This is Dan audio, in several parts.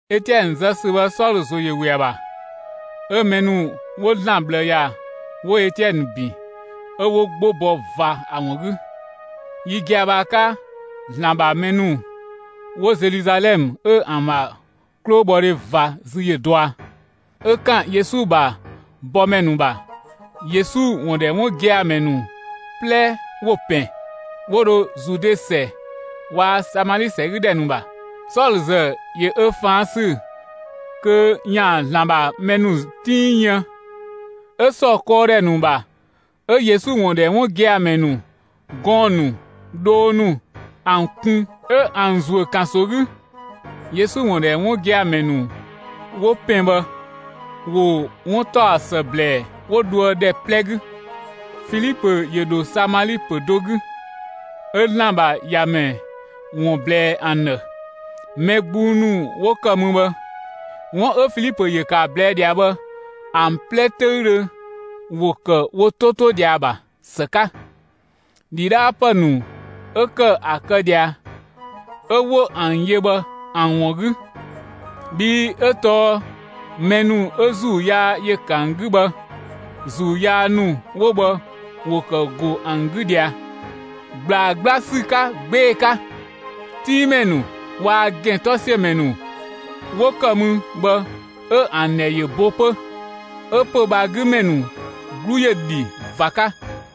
Etiɛnë zë ‑sü bhë, Sɔlö ‑zo ‑yö ‑we ‑a ‑bha. 'Ö mɛ ‑nu 'wo ‑Zlan ꞊bhlë ‑ya 'wo Etiɛnë ‑bin, 'ö 'wo 'gbo bɔ ꞊va ‑a ‑wun 'gü. Yi gia‑ bhë ‑a 'ka, ‑Zlan ‑bha mɛ ‑nu 'wo Zeluzalɛmë 'ö ‑an ‑bha 'klobhɔdhe ꞊va zü yö dɔa. 'Ö ‑kan Yesu ‑bha bɔmɛ ‑nu ‑bha, Yesu ‑wun ‑dhɛ 'wun gia‑ ‑mɛ ‑nu 'plɛ ‑wo ‑pɛn, 'wo dho Zude ‑sɛ waa‑ Samali ‑sɛ 'gü ‑dhɛ ‑nu ‑bha. Sɔlö ‑zë, ‑yö ö ꞊faan' sü kö ‑yaan ‑Zlan ‑bha mɛ ‑nu 'tiin yën. 'Ö ‑sɔ kɔɔdhɛ ‑nu ‑bha, 'ö Yesu ‑wun ‑dhɛ 'wun gia‑ ‑mɛ ‑nu, gɔɔn‑ ‑nu, dhoo ‑nu ‑an kun 'ö ‑an ‑zuö ‑kanso 'gü. Yesu ‑wun ‑dhɛ 'wun gia‑ ‑mɛ ‑nu 'wo ‑pɛn bhë, ‑wo 'wuntaɔsë ‑blɛɛ 'wo dhoë ‑dhɛ 'plɛ 'gü. Filipö ‑yö ‑dho Samali ‑pö do 'gü, 'ö ‑Zlan ‑bha ‑Yamɛ ‑wun ꞊blɛɛ ‑an ‑dhë. Mɛ gbung ‑nu 'wo ‑kë mü bhë, 'wun 'ö Filipö ‑yö ‑kë ‑a ꞊blɛɛ' ꞊dhia bhë, ‑an 'plɛ 'töüdhö ‑wo ‑kë wo 'to 'to ꞊dhia ‑a ‑bha ‑së 'ka, ‑dhidhaapë ‑nu 'ö ‑kë ‑a kë ꞊dhia 'ö 'wo ‑an yö bhë ‑an ‑wun 'gü. Bhii 'ö tɔɔ mɛ ‑nu 'ö ‑zuu yaa ‑yö ‑kë ‑an 'gü bhë, ‑zuu yaa ‑nu 'wo bhë ‑wo ‑kë ‑go ‑an 'gü ꞊dhia ꞊gblaa 'gbla ‑sü 'ka 'gbee‑ 'ka; 'tinngmɛ ‑nu waa‑ ‑gɛntɔsiömɛ ‑nu 'wo ‑kë mü bhë 'ö ‑an ‑dhɛ ‑yö bo 'pö. 'Ö pö‑ bhë ‑a 'gü ‑mɛ ‑nu 'glu ‑yö ‑dhi ꞊va 'ka.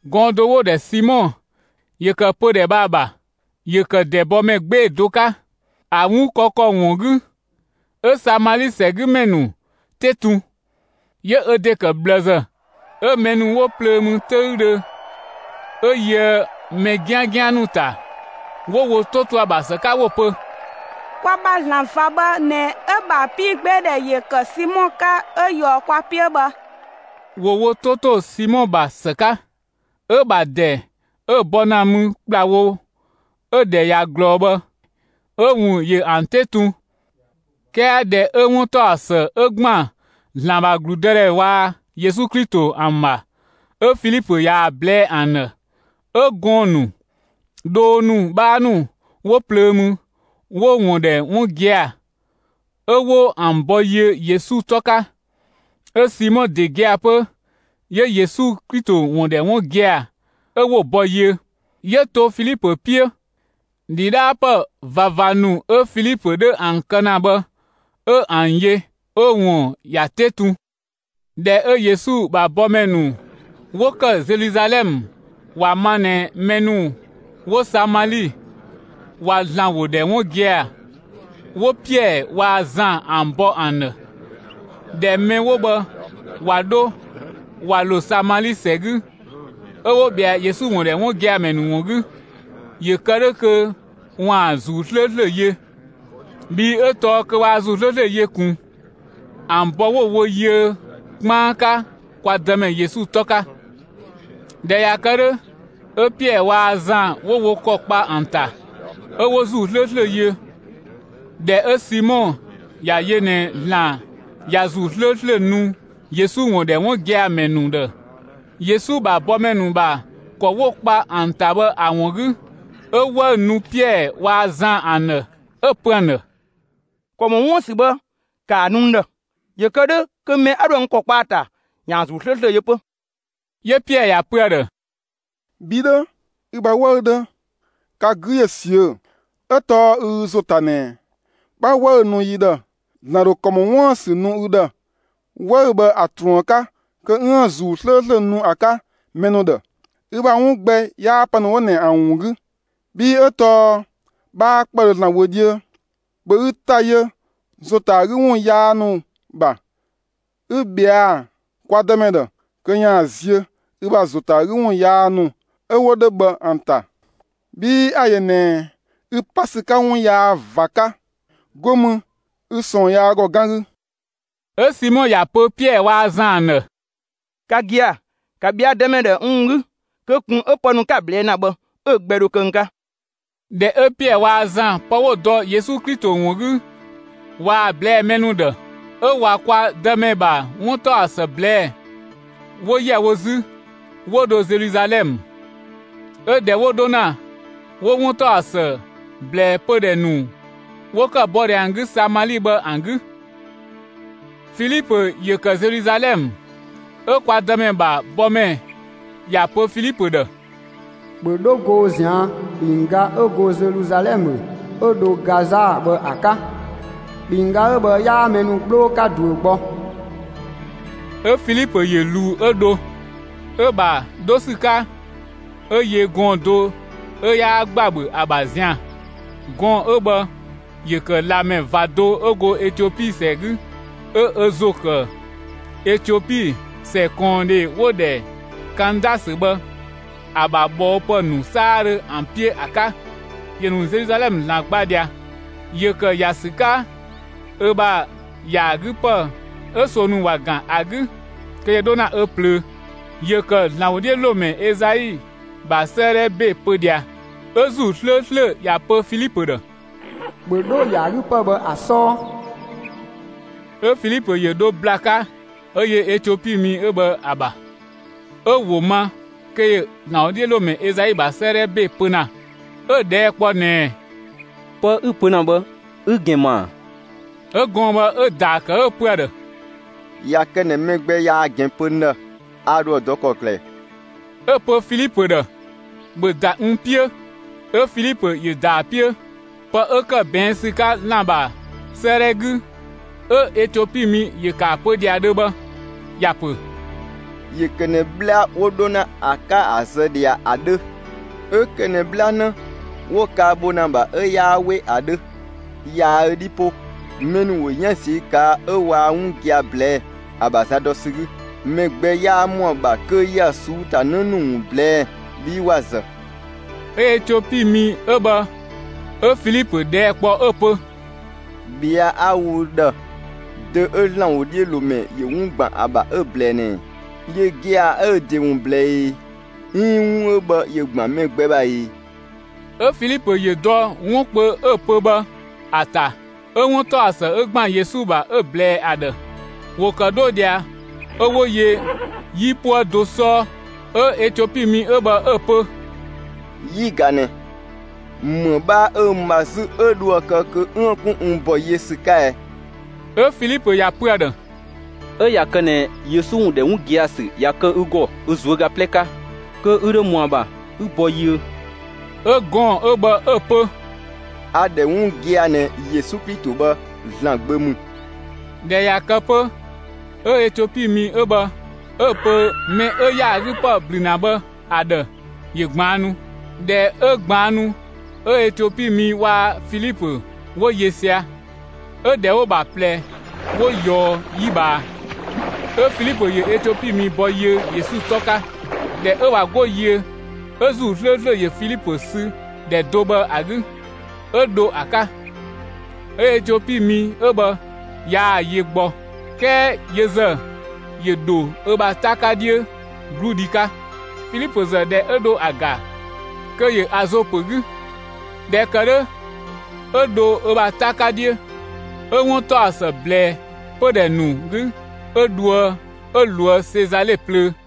Gɔɔn‑ do 'wo‑ ‑dhɛ Simɔ ‑yö ‑kë pödhɛ bhë ‑a ‑bha. ‑Yö ‑kë ‑dɛbɔmɛ 'gbee‑ do 'ka, ‑a ‑wun kë ‑kɔ ‑wun 'gü, 'ö Samali ‑sɛgümɛ ‑nu 'te tun, 'yö ö ‑de ‑kë ꞊bhlëzë. 'Ö mɛ ‑nu 'wo plöö mü 'töüdhö, 'ö yöë mɛ 'giangian ‑nu ‑ta, 'wo wo 'to to ‑a ‑bha ‑së 'ka 'wo‑ pö: «Kwa ‑bha ‑Zlan ꞊va bhë ꞊nɛ 'ö‑ ‑bha 'piigbeedhɛ ‑yö ‑kë Simɔ 'ka 'ö ꞊yɔɔ kwa 'piö bhë.» ‑Wo wo 'to ‑to Simɔ ‑bha ‑së 'ka. 'Ö‑ ‑bha ‑dɛ 'ö‑ bɔ ‑na mü ‑kplawo 'ö‑ ‑dhɛ ꞊ya ꞊glɔɔ bhë, 'ö‑ ‑wun ‑yö ‑an 'te tun. 'Kɛɛ ꞊dhɛ 'ö 'wuntaɔsë 'ö ‑gban ‑Zlan ‑bha ‑gludëdhɛ waa‑ Yesu Klito ‑an ‑bha, 'ö Filipö ꞊yaa‑ ꞊blɛɛ'‑ ‑an ‑dhë, 'ö gɔɔn‑ ‑nu, dhoo ‑nu 'bhaa ‑nu 'wo plöö mü, 'wo‑ ‑wun ‑dhɛ 'wun gia‑, 'ö 'wo ‑an bɔ yiö Yesu 'tɔ 'ka. 'Ö Simɔ ‑de gia‑ 'pö, 'yö Yesu Klito ‑wun ‑dhɛ 'wun gia‑. 'Ö 'wo‑ bɔ yiö. 'Yö to Filipö 'piö; ‑dhidhaapë ꞊vava ‑nu 'ö Filipö 'dhö ‑an kë ‑na bhë 'ö ‑an yö 'ö‑ ‑wun ‑ya 'te tun. ꞊Dhɛ 'ö Yesu ‑bha bɔmɛ ‑nu 'wo ‑kë Zeluzalɛmë ‑wa ma ꞊nɛ mɛ ‑nu 'wo Samali, ꞊wa ‑Zlan ‑wo ‑dhɛ 'wun gia‑, 'wo Piɛɛ waa‑ Zan ‑an bɔ ‑an ‑dhë. ꞊Dhɛ mɛ 'wo bhë ꞊wa 'dho ꞊wa ‑lo Samali ‑sɛ 'gü, 'ö 'wo ꞊bhɛa Yesu ‑wun ‑dhɛ 'wun gia‑ ‑mɛ ‑nu ‑wun 'gü, ‑yö kë 'dhö kö ‑waan ‑Zuu 'slööslö yö. Bhii 'ö tɔɔ kö waa ‑Zuu 'slööslö yö ꞊kun. ‑An bɔ 'wo‑ wo yiö 'kpaan 'ka kwa Dëmɛ Yesu 'tɔ 'ka. ꞊Dhɛ ꞊ya kë 'dhö, 'ö Piɛɛ waa‑ Zan 'wo wo ‑kɔ kpa ‑an ‑ta, 'ö 'wo ‑Zuu 'slööslö yö. ꞊Dhɛ 'ö Simɔ ‑ya yö ꞊nɛ ‑Zlan ꞊ya ‑Zuu 'slööslö nu Yesu ‑wun ‑dhɛ 'wun gia‑ ‑mɛ ‑nu ‑dhë, Yesu ‑bha bɔmɛ ‑nu ‑bha ‑kɔ 'wo‑ ‑kpa ‑an ‑ta bhë ‑a ‑wun 'gü, 'ö 'wëü‑ nu Piɛɛ waa‑ Zan ‑an ‑dhë, 'ö‑ pö ‑an ‑dhë: «‑Kɔ ‑mɔ 'wuën‑ ‑sü bhë, ‑kaa nu n ‑dhë, ‑yö kë 'dhö kö mɛ 'a 'dhoë‑ n ‑kɔ kpa ‑a ‑ta ‑yaan ‑Zuu 'slööslö yö 'pö!» 'Yö Piɛɛ ‑ya ‑pö ‑a ‑dhë: «Bhi 'dhö, ü ‑bha 'wëü‑ 'dhö, ka 'gü ‑yö ꞊siö'‑! 'Ö tɔɔ ü ü ‑zo ‑ta ꞊nɛ 'bha 'wëü‑ nu yi ‑dhë, ‑Zlan ‑dho ‑kɔ ‑mɔ 'wuën‑ ‑sü nu ü ‑dhë, 'wëü‑ bhë ‑a ꞊truën 'ka kö 'üën‑ ‑Zuu 'slööslö nu ‑a 'ka mɛ ‑nu ‑dhë. Ü ‑bha 'wun gbɛ 'yaa pë ‑nu 'wo ꞊nɛ ‑an ‑wun 'gü. Bhii 'ö tɔɔ 'bhaa 'kpëdhö ‑Zlan wö 'dhiö. ‑Bhö ü ‑ta yö ‑zo ‑ta ‑a 'gü ‑wun yaa ‑nu ‑bha 'ü ꞊bhɛa'‑ kwa Dëmɛ ‑dhë kö ‑yaan ziö ü ‑bha ‑zo ‑ta ‑a 'gü ‑wun yaa ‑nu 'ö 'wo 'dhö bhë ‑an ‑ta! Bhii a‑ ‑yö ꞊nɛɛ ü pa ‑sü 'ka 'wun yaa ꞊va 'ka. 'Go mü ü ꞊sɔɔn yaa ‑gɔ 'gan 'gü.» 'Ö Simɔ ‑ya pö Piɛɛ waa‑ Zan ‑an ‑dhë: «Ka gia‑, ‑ka ꞊bhɛa' Dëmɛ ‑dhë n ‑wun 'gü, kö ꞊kun 'ö pë ‑nu 'ka‑ ꞊blɛɛ' ‑na bhë 'ö‑ gbɛ dho kë n 'ka!» ꞊Dhɛ 'ö Piɛɛ waa‑ Zan pë 'wo‑ dɔ Yesu Klito ‑wun 'gü ꞊waa‑ ꞊blɛɛ'‑ mɛ ‑nu ‑dhë, 'ö ꞊wa kwa Dëmɛ ‑bha 'wuntaɔsë ꞊blɛɛ'‑, 'wo ‑yɛ wo 'zü, 'wo dho Zeluzalɛmë. 'Ö ꞊dhɛ 'wo 'dho ‑na, 'wo 'wuntaɔsë ꞊blɛɛ pödhɛ ‑nu 'wo ‑kë bɔ ꞊dhia ‑an 'gü Samali bhë ‑an 'gü. (Filipö ‑yö ‑kë Zeluzalɛmë, 'ö) kwa Dëmɛ ‑bha bɔmɛ ‑ya pö Filipö ‑dhë: «‑Bhö 'dho goo ꞊zian', ‑kpinngga 'ö go Zeluzalɛmë 'ö dho Gaza bhë ‑a 'ka! ‑Kpinngga 'ö bhë 'yaa mɛ ‑nu 'gbloo 'ka ꞊duö gbɔ.» 'Ö Filipö ‑yö ꞊luu 'ö dho. 'Ö‑ ‑bha 'dho ‑sü 'ka, 'ö yö gɔɔn‑ do 'ö 'yaa ‑gbabhö ‑a ‑bha zian‑. Gɔɔn‑ 'ö bhë ‑yö ‑kë ꞊lamɛ ꞊va do 'ö go Etiopi ‑sɛ 'gü 'ö ö ‑zo ‑kë Etiopi ‑sɛ ꞊kɔɔndhe 'wo‑ ‑dhɛ Kandasö bhë, ‑a ‑bha ꞊bhɔɔpë ‑nu 'saadhö ‑an 'piö ‑a 'ka. ‑Yö ‑nu Zeluzalɛmë ‑Zlan gba ꞊dhia. ‑Yö ‑kë ‑ya ‑sü 'ka ö ‑bha ‑yaagüpë 'ö ꞊soo ‑nu ‑wa ‑gan ‑a 'gü kö ‑yö 'dho ‑na ö ꞊plöö. ‑Yö ‑kë ‑Zlan ‑wodhiölomɛ Ezai ‑bha 'sëëdhɛ ‑be pö ꞊dhia. 'Ö ‑Zuu 'slööslö ‑ya pö Filipö ‑dhë: «‑Bhö 'dho ‑yaagüpë bhë ‑a 'sɔɔ!» 'Ö Filipö ‑yö ‑dho ‑bla 'ka 'ö yö Etiopi mi 'ö bhë ‑a ‑bha. 'Ö Ö‑ ‑wo ma kö ‑yö ‑Zlan ‑wodhiölomɛ Ezai ‑bha 'sëëdhɛ ‑be pö ‑na. 'Ö‑ ꞊dhɛɛ' kpɔ ꞊nɛɛ: «Pë 'ü‑ pö ‑na bhë 'ü‑ ‑gɛn ‑ma ‑a?» 'Ö gɔɔn‑ bhë 'ö‑ ‑daa ‑kë 'ö‑ pö ‑a ‑dhë: «꞊Ya kë ꞊nɛ mɛ gbɛ yaa‑ ‑gɛn pö n ‑dhë, a ‑dho ‑a dɔ ‑kɔklë ꞊ɛ?» 'Ö‑ pö Filipö ‑dhë: «‑Bhö ‑da n 'piö!» 'Ö Filipö ‑yö ‑da ‑a 'piö. Pë 'ö ‑kë ꞊bɛɛn' ‑sü 'ka ‑Zlan ‑bha 'sëëdhɛ 'gü, 'ö Etiopi mi ‑yö ‑kë ‑a pö ꞊dhia dhö bhë ‑ya pö: ‑Yö ‑kë ꞊nɛ 'bhla 'wo 'dho ‑na ‑a 'ka ‑a zë ꞊dhia ‑a 'dhö. 'Ö ‑kë ꞊nɛ 'bhlanë 'ö 'wo‑ kaa‑ bho ‑na ‑a ‑bha 'ö 'yaa 'we ‑a 'dhö. Yaa ö 'dhi 'po. Mɛ ‑nu ‑wo 'yan ꞊ziö' ꞊kaa' ö waa 'wun gia‑ ꞊blɛɛ'‑, ‑a ‑bha za dɔ ‑sü 'gü. Mɛ gbɛ 'yaa ‑mɔa ‑bha kö ‑ya ꞊suu'‑ ‑ta 'në ‑nu ‑wun ꞊blɛɛ'‑, bhii ‑wa ‑zë. 'Ö Etiopi mi 'ö bhë 'ö Filipö ꞊dhɛɛ' kpɔ 'ö‑ pö: «꞊Bhɛa' 'a‑ wo ü ‑dhë, dö 'ö ‑Zlan ‑wodhiölomɛ ‑yö 'wun ‑gban ‑a ‑bha 'ö‑ ꞊blɛɛ ꞊nɛɛ? Yö gia‑ 'yö ö ‑de ‑wun ꞊blɛɛ e, 'iin 'wun 'ö bhë ‑yö ‑gban mɛ gbɛ ‑bha e?» 'Ö Filipö ‑yö dɔ 'wun kpö 'ö‑ pö bhë ‑a ‑ta, 'ö 'wuntaɔsë 'ö ‑gban Yesu ‑bha 'ö‑ ꞊blɛɛ ‑a ‑dhë. ‑Wo ‑kë 'dho ꞊dhia 'ö 'wo yö 'yipuë do 'sɔɔ; 'ö Etiopi mi 'ö bhë 'ö‑ pö: «'Yi ꞊ga ꞊nɛ; ‑më 'bhaa 'ö n ‑ma 'zü 'ö dhoë‑ kë kö 'üën‑ 'kun n ‑bɔ yiö ‑sü 'ka ɛ?» ['Ö Filipö ‑ya pö ‑a ‑dhë: «'Ö ꞊ya kë ꞊nɛ Yesu ‑wun ‑dhɛ 'wun gia‑ ‑sü ꞊ya kë ü ‑gɔ ü ꞊zuöga 'plɛ 'ka, kö ü ‑dho ‑mɔa ‑bha 'ü ‑bɔ yiö.» 'Ö gɔɔn‑ 'ö bhë 'ö‑ pö: «A‑ ‑dhɛ 'wun gia‑ ꞊nɛ Yesu Klito bhë ‑Zlan Gbö ‑mü.»] ꞊Dhɛ ꞊ya kë 'pö 'ö Etiopi mi 'ö bhë 'ö‑ pö mɛ 'ö ‑yaagüpë ‑blü ‑na bhë ‑a ‑dhë ‑yö ꞊gbaannu. ꞊Dhɛ 'ö ꞊gbaannu, 'ö Etiopi mi waa‑ Filipö 'wo yö sia‑, 'ö ‑dhɛ 'wo‑ ‑bha ꞊plɛ 'wo ꞊yɔɔ 'yi ꞊bhaa, 'ö Filipö ‑yö Etiopi mi ‑bɔ yiö Yesu 'tɔ 'ka. ꞊Dhɛ 'ö ꞊wa 'go yiö 'ö ‑Zuu 'slööslö ‑yö Filipö sü ‑dhɛ do bhë ‑a 'gü 'ö dho ‑a 'ka. 'Ö Etiopi mi 'ö bhë yaa‑ yö gbɔ. 'Kɛɛ yö ‑zë, ‑yö ‑dho ö ‑bha 'ta 'ka 'dhiö 'gludhi 'ka. Filipö ‑zë ꞊dhɛ 'ö dho ‑a ‑ga kö ‑yö Azo ‑pö 'gü. ꞊Dhɛ ‑kë 'dhö 'ö dho ö ‑bha 'ta 'ka 'dhiö, 'ö 'wuntaɔsë ꞊blɛɛ pödhɛ ‑nu 'gü 'ö dhoë 'ö ꞊loë' Sezale plöö.